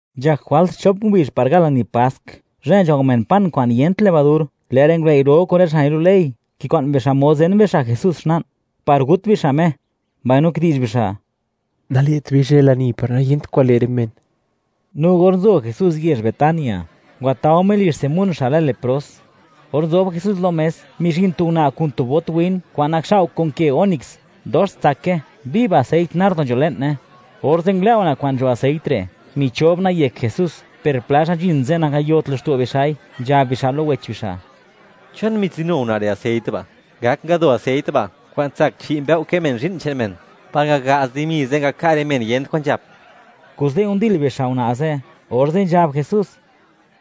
Nzhak jwalt xchop ngubizh par gal lani Pask, zhë nzhao men pan kwa'n yent levadur. Lë' rë ngulëi' ro kun rë xa' nilu' ley, kikwa'n bixa' mod zen bixa' Jesús xla'n, par gut bixa' Me, mbaino kidi'zh bixa': ―Nale't bei zhë lani, par nayent kwan le' rë men. No or nzo Jesús yezh Betania, ngwatao Me lizh Simón xa' lë “Lepros”. Or nzob Jesús lo mes, mizhin tu una' kun tu bot win kwa'n nakxao' kun ke ónice, dox tsake; viv aseit nardo nzho le'ne. Orze' ngulë' una' kwa'n nzho aseit re', michob una'i yek Jesús. Per pla xa' nzhin ze', nangayot laxto' bixa'i, nzhab bixa' lo wech bixa': —¿Chon mitsinu una' re' aseit ba'? Ngak ngado aseit ba' kwa'n tsak chi' mbëo' kë men zhi'n che'n men, par ngaga'z dimi ze', ngaka' rë men yent kwan nzhap. Kuze', ndil bixa' una' ze'. Orze' nzhab Jesús: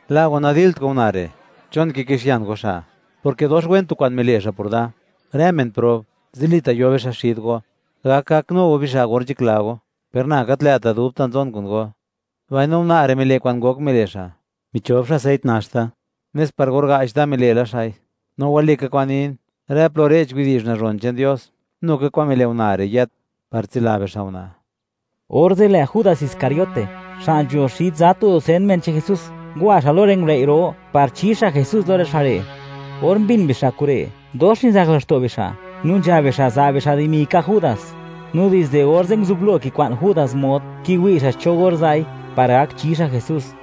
―La' go, nadilt go una' re'; ¿chon kikixian go xa'?, porke dox wen tu kwa'n mile' xa' por da; rë men prob, zilita' yo bixa' xid go, gak gaknu go bixa' or nzhakla go; per na gat lë'ta' dubta' zon kun go. Mbaino una' re', mile' kwa'n ngok mile' xa'; michob xa' aseit nax da, nes par or ga'ch da mile' la xa'i. No walika kwa'n nin; rë plo re'ch widi'zh nazhon che'n Dios, nu ka kwa'n mile' una' re' yët, par tsila bixa' una'. Orze', lë' Judas Iscariote, xa' nzho xid za tu dusen men che'n Jesús, ngwa xa' lo rë ngulëi' ro, par chi xa' Jesús lo rë xa' re'. Or mbin bixa' kure', dox nizak laxto' bixa', no nzhab bixa', za' bixa' dimi ka' Judas. No dizde orze', nguzublo kikwa'n Judas mod, kiwi' xa' cho or za'i, par gak chi xa' Jesús.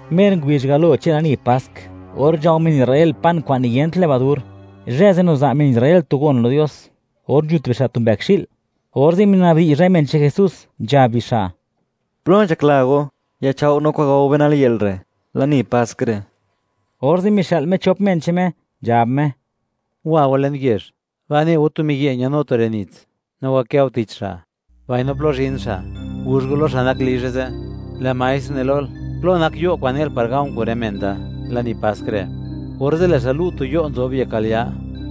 Mer ngubizh galo che'n lani pask, or nzhao men Israel pan kwa'n niyent levadur, zhë ze' niza' men Israel tu gon lo Dios, or nzhut bixa' tu mbëkxi'l. Orze' mina'bdi'zh rë men che'n Jesús, nzhab bixa': ―¿Plo nzhakla go yachao' no kwa'n gao be nal yë'l re', lani Pask re'? Orze' mixë'l Me chop men che'n Me, nzhab Me: ―Wa go le'n yezh; ba' ne go tu miyi' ñanu tu re' nits, no wakë go tich xa'. Mbaino plo zhin xa', guzh go lo xa' nak lizhe ze': “Lë' Maestr ne lol: ¿Plo nak yo' kwa'n ne'l, par ga̱o̱ kun rë men da, lani Pask re'?” Orze' lë' xa' lu' tu yo' nzob yek al ya,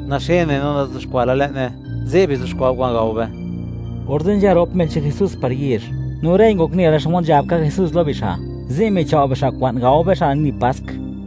naxene, no nazuxkwa' la le'ne; ze' bizuxkwa' go kwa'n gao be. Orze' nzha rop men che'n Jesús par yezh; no rëi ngok nela xmod nzhab ka Jesús lo bixa'; ze' michao' bixa' kwa'n gao bixa' lani Pask.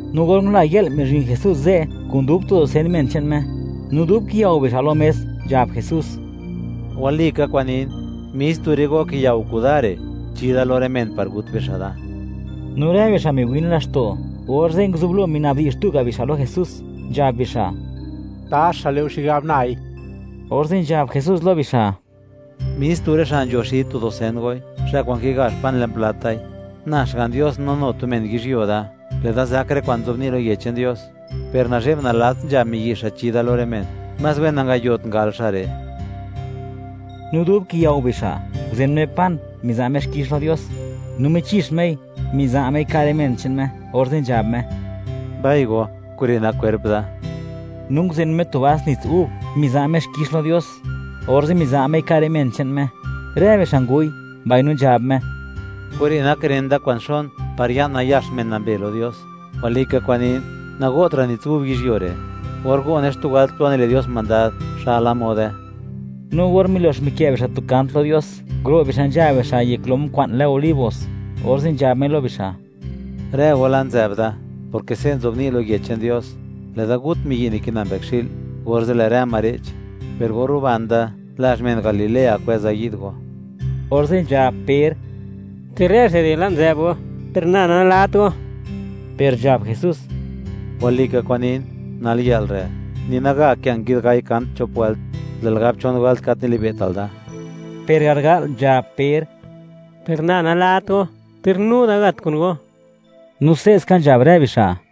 No or ngula yë'l, mizhin Jesús ze', kun dub tu dusen men che'n Me. No dub kiyao bixa' lo mes, nzhab Jesús: ―Walika kwa'n nin, mis tu rë go kiyao kuda re', chi da lo rë men par gut bixa' da. No rë bixa' miwin laxto', orze' nguzublo minabdi'zh tuga' bixa' lo Jesús, nzhab bixa': ―¿Taxa le' go xigab nai? Orze' nzhab Jesús lo bixa': ―Mis tu rë xa' nzho xid tu dusen goi, xa' kwa'n kigazh pan le'n plat dai. Na Xga'n Dios no nu tu men yizhyuo da; lë'da zak rë kwa'n nzobni' lo Yech che'n Dios, ¡per nazhe'b nalats nzha miyi' xa' chi da lo rë men! Más wen nangayot ngal xa' re'. No dub kiyao bixa', nguzen Me pan, miza' Me xkix lo Dios, no michix Mei, miza' Mei ka' rë men che'n Me, orze' nzhab Me: ―Mbai go, kure' nak kwerp da. No nguzen Me tu vas nits gub, miza' Me xkix lo Dios, orze' miza' Mei ka' rë men che'n Me, rë bixa' ngu'y, mbaino nzhab Me: ―Kure' nak ren da kwa'n xon, par ya'n nayax men nambe lo Dios. Walika kwa'n nin, nago'tra' nits gub yizhyuo re'. Or go'ne xtu wëlt plo nile' Dios mandad, xa'la mode. No or milox mikë' bixa' tu kant lo Dios, nguro' bixa' nzha bixa' yek lom kwa'n lë Olivos, orze' nzhab Me lo bixa': ―Rë go la' nzë'b da, porke se' nzobni' lo Yech che'n Dios: “Lë'da gut miyi' nikina mbëkxi'l, orze' lë' rë ma re'ch.” Per or ruban da, lazh men Galilea kwëza yi'd go. Orze' nzhab Per: ―Ter rë xa' re' la' nzë'b go; per na, nalat go. Per nzhab Jesús: ―Walika kwa'n nin, nal yë'l re', ni naga kë' nguid gai kant chop wëlt, lë'l gab chon wëlt gat nili'be'tal da. Per garga'l nzhab Per: ―¡Per na nalat go ter nu da gat kun go! No se'ska nzhab rë bixa'.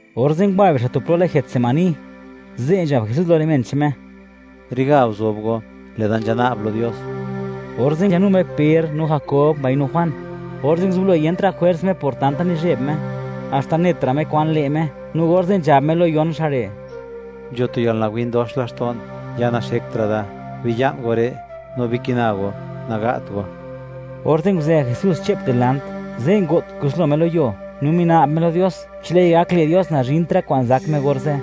Orze' ngwa bixa' tu plo lë Getsemaní, ze' nzhab Jesús lo rë men che'n Me: ―Riga guzob go, lë'da nzhana'b lo Dios. Orze' nzhanu Me Per, no Jakob, mbaino Juan; orze' nguzublo niyentra' jwers Me por tanta nizheb Me, haxta netra' Me kwan le' Me, no orze' nzhab Me lo yon xa' re': ―Nzho tu yalnawin dox laxto'n, ya naxektra' da; biya'n go re' no bikina go; naga't go. Orze' nguzë Jesús xche'p dilant; ze' ngo't kuslo Me lo yuo, no mina'b Me lo Dios, chi lë'i gak le' Dios, nazhint rë kwa'n zak Me orze'.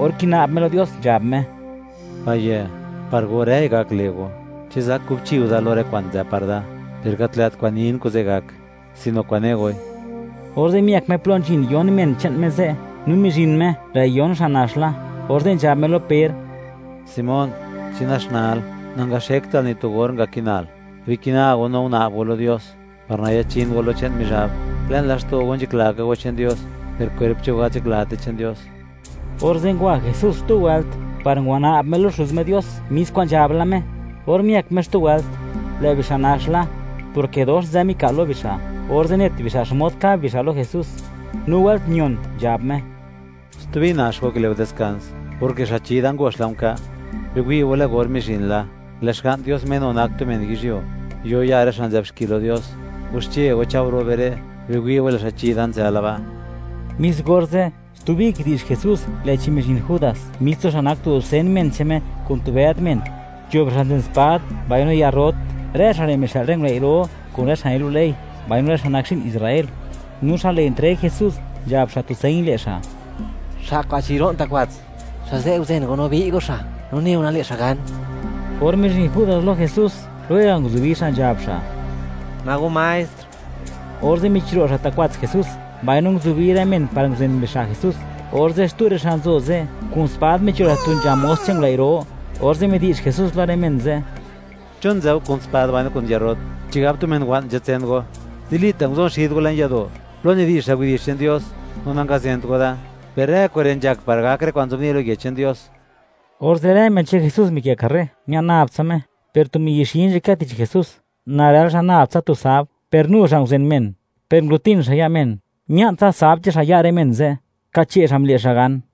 Or kina'b Me lo Dios, nzhab Me: ―Payë', par go, rëi gak le' go. ¿Chi zak kubchi go da lo rë kwa'n nzë par da? Per gat lë't kwa'n nin, kuze' gak; sino kwa'n ne goi. Orze' miëk Me plo nzhin yon men che'n Me ze'; no mizhin Me, lë' yon xa' nax la. Orze' nzhab Me lo Per: ―Simón, ¿chi naxnal? Nangaxektal ni tu or, ngakinal. Bikina go no guna'b go lo Dios, par nayachin go lo che'n Mizhab. Le'n laxto' go nzhakla ka go che'n Dios, per kwerp che'n go gat nzhaklat che'n Dios. Orze' ngwa Jesús xtu wëlt, par ngwana'b Me lo Xuz Me Dios, mis kwa'n nzhab la Me. Or miëk Me xtu wëlt, lë' bixa' nax la, porke dox nzë mika'l lo bixa'; orze' net bixa' xmod kab bixa' lo Jesús. No wëlt mion nzhab Me: ―¿Stubi nax go, kile' go diskans? Porke xa' chi da, ngox la nka'. Biwi' go, lë' or mizhin la, lë' Xga'n Dios Me nu nak tu men yizhyuo, yo ya' rë xa' nzë'b xki lo Dios. Waxche go, cha'o, ro' be re'; biwi' go, lë' xa' chi da nzë la ba'. Mis orze', stubi kidi'zh Jesús; lë'chi mizhin Judas, mis tu xa' nak tu dusen men che'n Me, kun tu bëd men, nzho bixa' nzen spad mbaino yarrot. Rë xa' re' mixë'l rë ngulëi' ro, kun rë xa' nilu' ley, mbaino rë men Israel xa' nak zhi'n. No xa' le' entreg Jesús, nzhab xa' tu señ le' xa': “Xa' kwa'n chiro'n ta' kwats, xa' ze' guzen go no bi'y go xa'; no neo, nale' xa' gan.” Or mizhin Judas lo Jesús, lwega' nguzubi xa', nzhab xa': ―¿Ma go Maestr? Orze' michiro' xa' ta' kwats Jesús, mbaino nguzubi rë men par nguzen bixa' Jesús. Orze' xtu rë xa' nzo ze', kun spad micho' xa' tu nzha mos che'n ngulëi' ro, orze' midi'zh Jesús lo rë men ze': ―¿Chon nzë go kun spad mbaino kun yarrot? ¿Chigab tu men wa'n nzatsen go? Zilita' nguzon xid go le'n yado', plo nidi'zha widi'zh che'n Dios; no nangazent go da. Per rë kure' nzhak par gak rë kwa'n nzobni' lo Yech che'n Dios. Orze', rë men che'n Jesús mikë' karre, mia'n nab tsa Me. Per tu miyi' xi nzhakë tich Jesús, narël xa' nab tsa tu sab, per nu xa' nguzen men, per nguro'tin xa' ya' men, mia'ntsa sab che'n xa' ya' rë men ze', kache' xa' mile' xa' gan.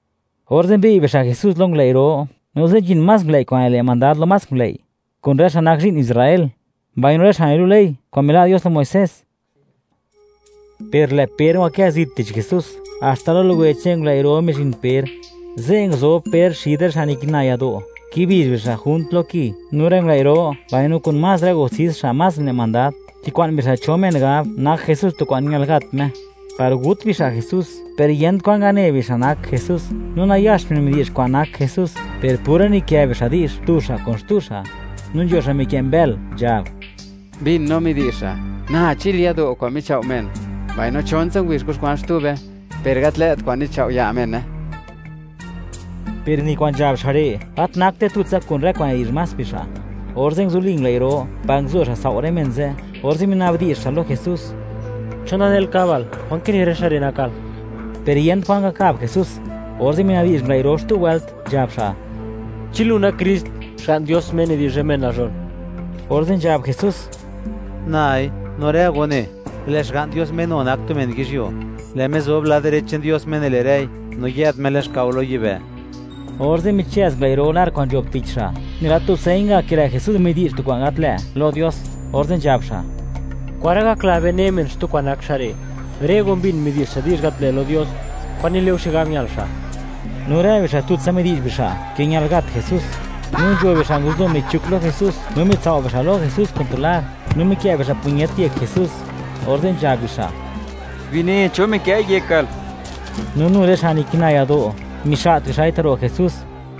Orze' mbi'y bixa' Jesús lo ngulëi' ro; no ze' nzhin más ngulëi' kwa'n nile' mandad lo más ngulëi', kun rë men Israel xa' nak zhi'n, mbaino rë xa' nilu' ley kwa'n mila' Dios lo Muisés. Per lë' Per ngwakë zit tich Jesús, haxta lo luwe che'n ngulëi' ro mizhin Per. Ze' nguzob Per xid rë xa' nikina yado', kibizh bixa' junt lo ki. No rë ngulëi' ro, mbaino kun más rë gustis xa' más nile' mandad, kikwa'n bixa' cho men gab, nak Jesús tu kwa'n ñal gat Me, par gut bixa' Jesús; per yent kwan ngane bixa', nak Jesús. No nayax men midi'zh kwa'n nak Jesús, per pura nikë bixa' di'zh, tu xa' kun xtu xa'. No nzho xa' mikë' mbël nzhab: ―Mbin no midi'zh xa': “Na chil yado' kwa'n michao' men, mbaino chontsa ngubizh kuxkwa'n xtube, per gat lë't kwa'n nichao' ya' mene.” Per ni kwa'n nzhab xa' re', gat nakte tutsa kun rë kwa'n nidi'zh más bixa'. Orze' nguzuli ngulëi' ro, par nguzo xa' sao' rë men ze', orze' minabdi'zh xa' lo Jesús: ―¿Chon nanel kabal? ¿Kwan kine rë xa' re' nakal? Per yent kwan ngakab Jesús. Orze' minabdi'zh ngulëi' ro xtu wëlt, nzhab xa': ―¿Chi lu nak Krist, Xga'n Dios Me nidi'zh rë men nazhon? Orze' nzhab Jesús: ―Nai. No rë go ne, lë' Xga'n Dios, Me nu nak tu men yizhyuo; lë' Me zob lad direch che'n Dios Me nile' rëi; no yë'd Me le'n xkao lo yibë'. Orze' michëz ngulëi' ro lar kwa'n nzho'b tich xa', nela tu señ ga' ke lë' Jesús midi'zh tu kwa'n gat lë' lo Dios. Orze' nzhab xa': ―¿Kwan ra' gakla be, ne men, xtu kwa'n nak xa' re'? Rë go mbin, midi'zh xa' di'zh gat lë' lo Dios. ¿Kwan nile'u xigab ñal xa'? No rë bixa', tutsa midi'zh bixa', ke ñal gat Jesús. No nzho bixa' nguzublo michuk lo Jesús; no mitsao' bixa' lo Jesús kun tu lar, no mikë' bixa' puñet yek Jesús, orze' nzhab bixa': ―¡Bine cho mikë'i yekal! No nu rë xa' nikina yado', mixa't bixa'i ta'ro' Jesús.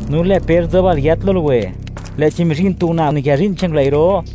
No lë' Per nzob al yët lo luwe, lë'chi mizhin tu una' nikë zhi'n che'n ngulëi' ro,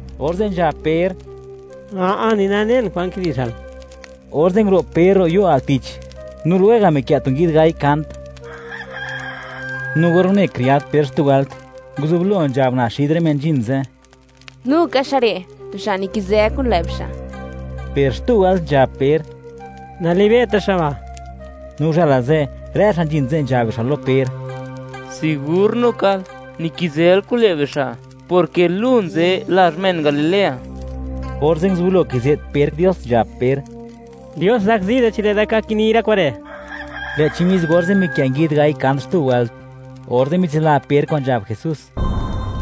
Orze' nzhab Per: ―¡A'a! ¡Ni nanen kwan kidi'zhal! Orze' nguro' Per ro' yo' al tich. (No lwega' mikë' tu nguid gai kant.) No or une kriad Per xtu wëlt, nguzublo nzhab una' xid rë men nzhin ze': ―¡Nuka xa' re', tu xa' nikizë kun lë' bixa'! Per xtu wëlt nzhab Per: “Nalibe'ta' xa' ba'”, no uzhëla ze', rë xa' nzhin ze' nzhab bixa' lo Per: ―¡Sigur nukal nikizël kun lë' bixa', porke lu nzë lazh men Galilea! Orze' nguzublo kize't Per Dios, nzhab Per: ―¡Dios zakzi da chi lë'da ka kini rë kure'! Lë'chi mis orze', mikë' nguid gai kant xtu wëlt. Orze' mitsila Per kwa'n nzhab Jesús: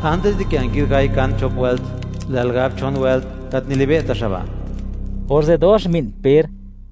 “Antis di kë' nguid gai kant chop wëlt, lë'l gab chon wëlt: Gat nili'be'ta' xa' ba'.” Orze' dox mbi'n Per.